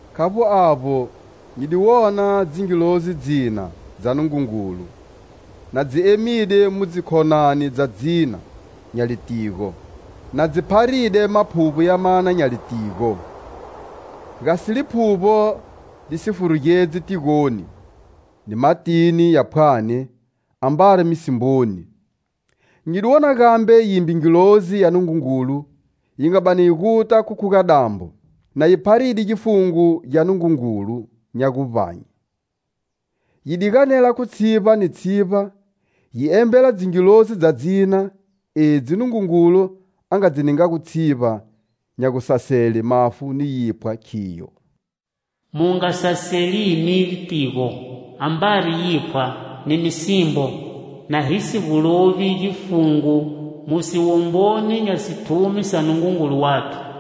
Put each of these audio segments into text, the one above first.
Khavbo avbo, nyi di wona dzingilzi dzina dza Nungungulu na dzi emide mu dzikhonani dza dzina nya litigo, na si pharide maphuvbo ya mana nya litigo, gasi Liphuvbo li si furugedzi tigoni, ni matini ya phwani ambari misimboni. Nyi di wona gambe yimbe ngilozi ya Nungungulu yi nga bani yi guta khu khuga-dambo, na yi pharide gifungo gya Nungungulu nya guvbanye. Yi di ganela khu tshivba ni tshivba, yi embela dzingilozi dza dzina edzi Nungungulu a nga dzi ningago tshivba nya gusasele mafu ni yiphwa, khiyo: "Mu nga saselini litigo, ambari yiphwa, ni misimbo, na hi si gu lovi gifungo mu siwomboni nya sithumi sa Nungungulu wathu."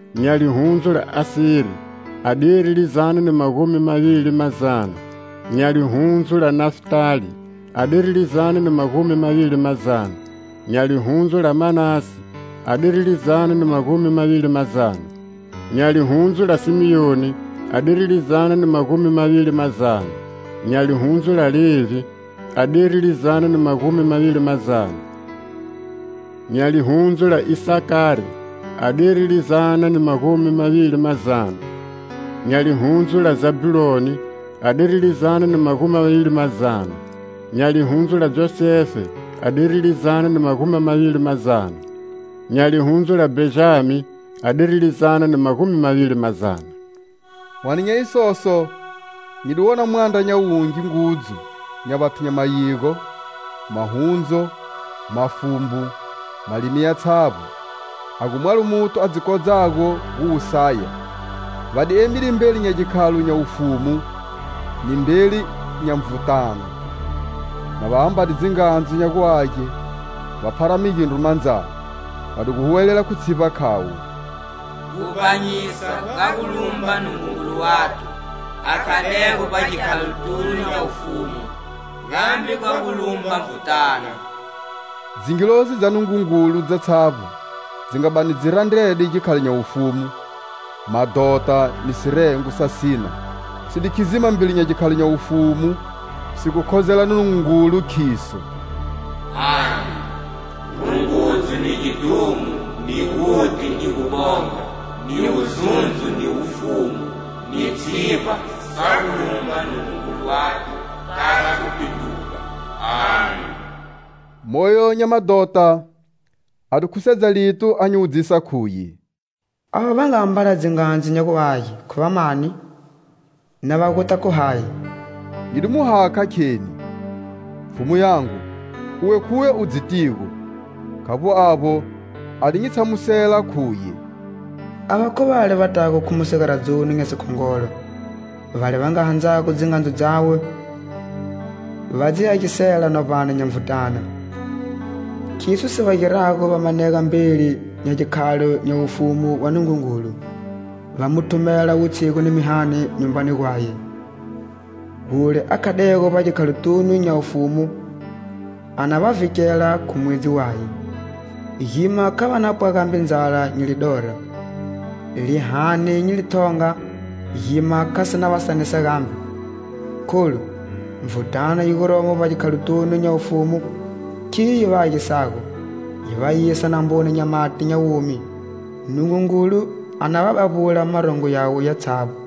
nya lihundzu la Aseri, adiri lizana ni magumi mavili mazana; nya lihundzu la Nafitali, adiri lizana ni magumi mavili mazana; nya lihundzu la Manase, adiri lizana ni magumi mavili mazana; nya lihundzu la Simioni, adiri lizana ni magumi mavili mazana; nya lihundzu la Levhi, adiri lizana ni magumi mavili mazana; nya lihundzu la Isakari adiri lizana ni magumi mavili mazana; nya lihundzu la Zabhuloni, adiri lizana ni magumi mavili mazana; nya lihundzu la Josefe adiri lizana ni magumi mavili mazana; nya lihundzu la Bhenjami, adiri lizana ni magumi mavili mazana. Hwane nya isoso nyi di wona mwandra nya wungi ngudzu nya vathu nya mayigo, mahundzu, mafumbu, malimi yatshavbo, a gu mwalo muthu a dzi kodzago gu wu saya. Va di emide mbeli nya gikhalo nya wufumu ni mbeli nya Nvutana, na va ambade dzingandzu nya gu age, va phara migindru mandzani. Va di gu huwelela khu tshivba khavo: "Guvbanyisa ga gu lumba Nungungulu wathu,a khadego vbagikhalotunu nya wufumu, gambe gwa gu lumba Nvutana." Dzingilozi dza Nungungulu dzatshavbo dzi nga bani dzi randrede gikhalo nya wufumu, madhota ni sirengo sa sina, dzi di khidzima mbeli nya gikhalo nya wufumu si gu khozela Nungungulu, khidzo: "Amen! Rungudzo ni gidhumo ni guti ni gubonga ni wuzundzo ni wufumu ni tshivba sa gu lumba Nungungulu wathu kala gupindruga. Amen!" Moyo nya madhota a di khusedza lito a nyi wudzisa, khuye: "Ava va nga ambala dzingandzu nya gu age khu vamani, na va guta khu hayi?" Nyi di mu hakha kheni: "Pfhumu yangu, uwe khuwe u dzitigo!" Khavbo avbo, a di nyi tshamusela, khuye: "Ava khu vale va tago khu mu sigaradzoni nya sikhongolo, vale va nga handzago dzingandzu dzawe va dzi agisela novbani nya Nvutana. Khiso si va girago va manega mbeli nya gikhalo nya wufumu wa Nungungulu, va mu thumela wutshigu ni mihani nyumbani gwaye. Wule a khadego vbagikhalotunu nya wufumu a na va vhikela khu mwedzi waye. Gima kha va na pwa gambe ndzala ni lidora, lihani ni lithonga gima kha si na va sanisa gambe. Kholu Nvutana yi guromo vbagikhalotunu nya wufumu khiyo yi va havisago, yi va yisa namboni nya mati nya womi. Nungungulu a na va bavbula marongo yawe yatshavbo."